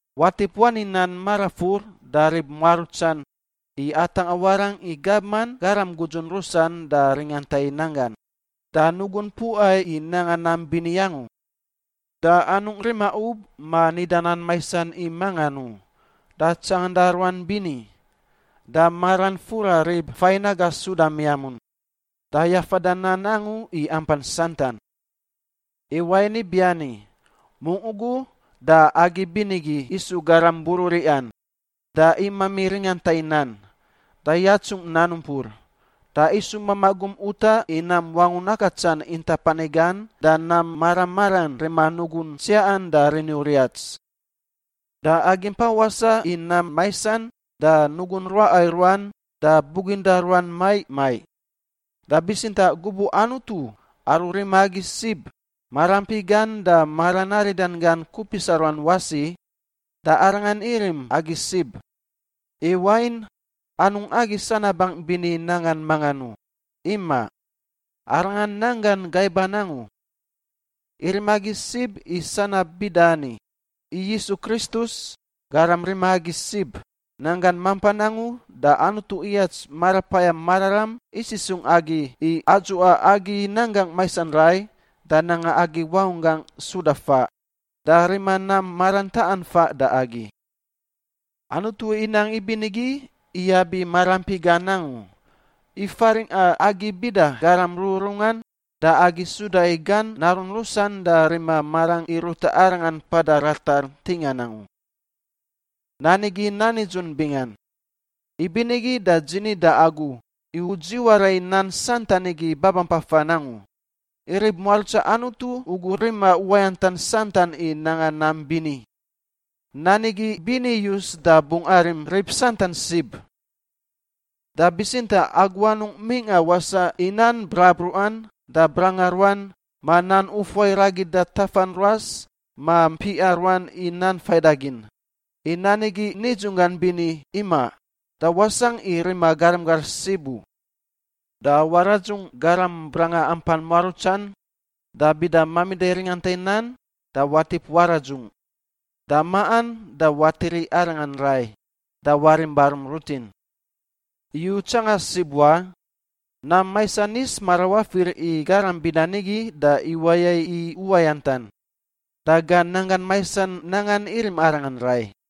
Watip wani nan marafur da rib muarutsan i atangꞌa warangꞌ i gabman garam gudzun rusan da ringanta i nan gan, da nugun puꞌa i nanga nam bini angu, da anungꞌ rima ub ma nida nan maisan i mangan u, da tsanganda ruan bini, da maran fura rib fain aga suda miamun, da yafada nan angu i ampan santan. I wain ibiani, mungꞌ ugu da agi binigi isu garam bururiꞌan, da imami ringanta i nan, da yatsungꞌ nan umpur. Da isu mamaꞌ gum utaꞌ i nam wangun akatsan intap ani gan da nam mara maran rima nugun tsiaꞌan da rini uriats. Da agi mpa wasaꞌ i nam maisan da nugun ruaꞌa i ruan da buginda ruan maiꞌ maiꞌ. Da bitsintaꞌ gubuꞌ Anutu, aru rima agi sib, maraampi gan da maran aridan gan kupisa ruan wasi, da Arangan irim agi sib, i wain, anungꞌ agi sanabangꞌ bini nangan mangan u, imaꞌ, Arangan nanggan gaiban angu. Irim agi sib i sanab bida ani: i Yisus Kristus, Garam rima agi sib, nanggan mampan angu da Anutu iyats Marapayam Mararam isisungꞌ agi i adzuꞌa agi nanggangꞌ maisan rai da nanga agi wangunggangꞌ suda faꞌ da rima nam maran taꞌan faꞌ da agi. Anutu inang ibinigi iyab i maraampi gan angu, i faringꞌa agi bida garam rururungan da agi suda i gan narun rusan da rima marangꞌ i ruta Arangan mpada ratar ntingan angu. Nan igi nan nidzun bingan. Ibinigi da dzi ni da agu i u dziwara i nan santan igi babampafan angu, i rib muarutsa Anutu ugu rima uwayantan santan i nanga nam bini. Nan igi bini iyus da bungꞌ arim rib santan sib. Da bitsintaꞌ agu anungꞌ mingꞌa wasaꞌ i nan brabruꞌan da branga ruan ma nan ufuai ragida tafan ruas ma mpiꞌa ruan i nan faidagin, i nan igi nidzunggan bini imaꞌ da wasangꞌ i rima garam gar sib u. Da waradzungꞌ garam branga ampan muarutsan, da bida mamida i ringanta i nan, da watip waradzungꞌ, da maꞌan, da watiri arangan rai da warim barum rutin. I u tsanga sib wa, nam maisan yis marawafir i garam bida nigi da iwaya i uwayantan, da gan nanggan maisan nangan irim arangan rai.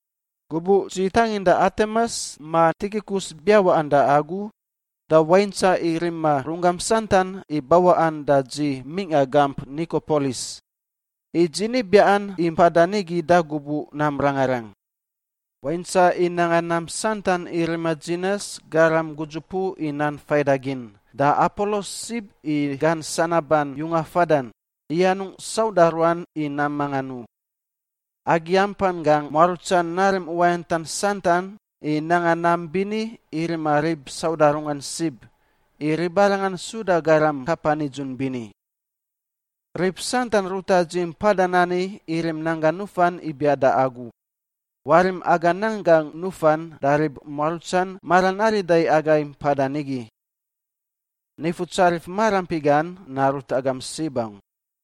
Gubuꞌ dzi tanginda Atemas ma Tikikus biawaꞌan da agu, da waintsaꞌ i rima runggam santan i bawaꞌan da dzi mingꞌa gamp Nikopolis, i dzi ni biaꞌan i mpada nigi da gubuꞌ nam rangarang. Waintsaꞌ i nanga nam santan i rima Dzinas, garam gudzupuꞌ i nan faidagin, da Apolos sib i gan sanaban yunga fadan, i anungꞌ sauda ruan i nam mangan u. Agi ampan gangꞌ muarutsan narim uwayantan santan i nanga nam bini i rima rib sauda runggan sib, i ribarangan suda garam kapa nidzun bini. Rib santan ruta dzi mpadan ani irim nan gan nufan ibiaꞌ da agu. Warim aga nan gangꞌ nufan da rib muarutsan maran arida i agai mpada nigi. Nifutsarif maraampi gan narut agam sib angu.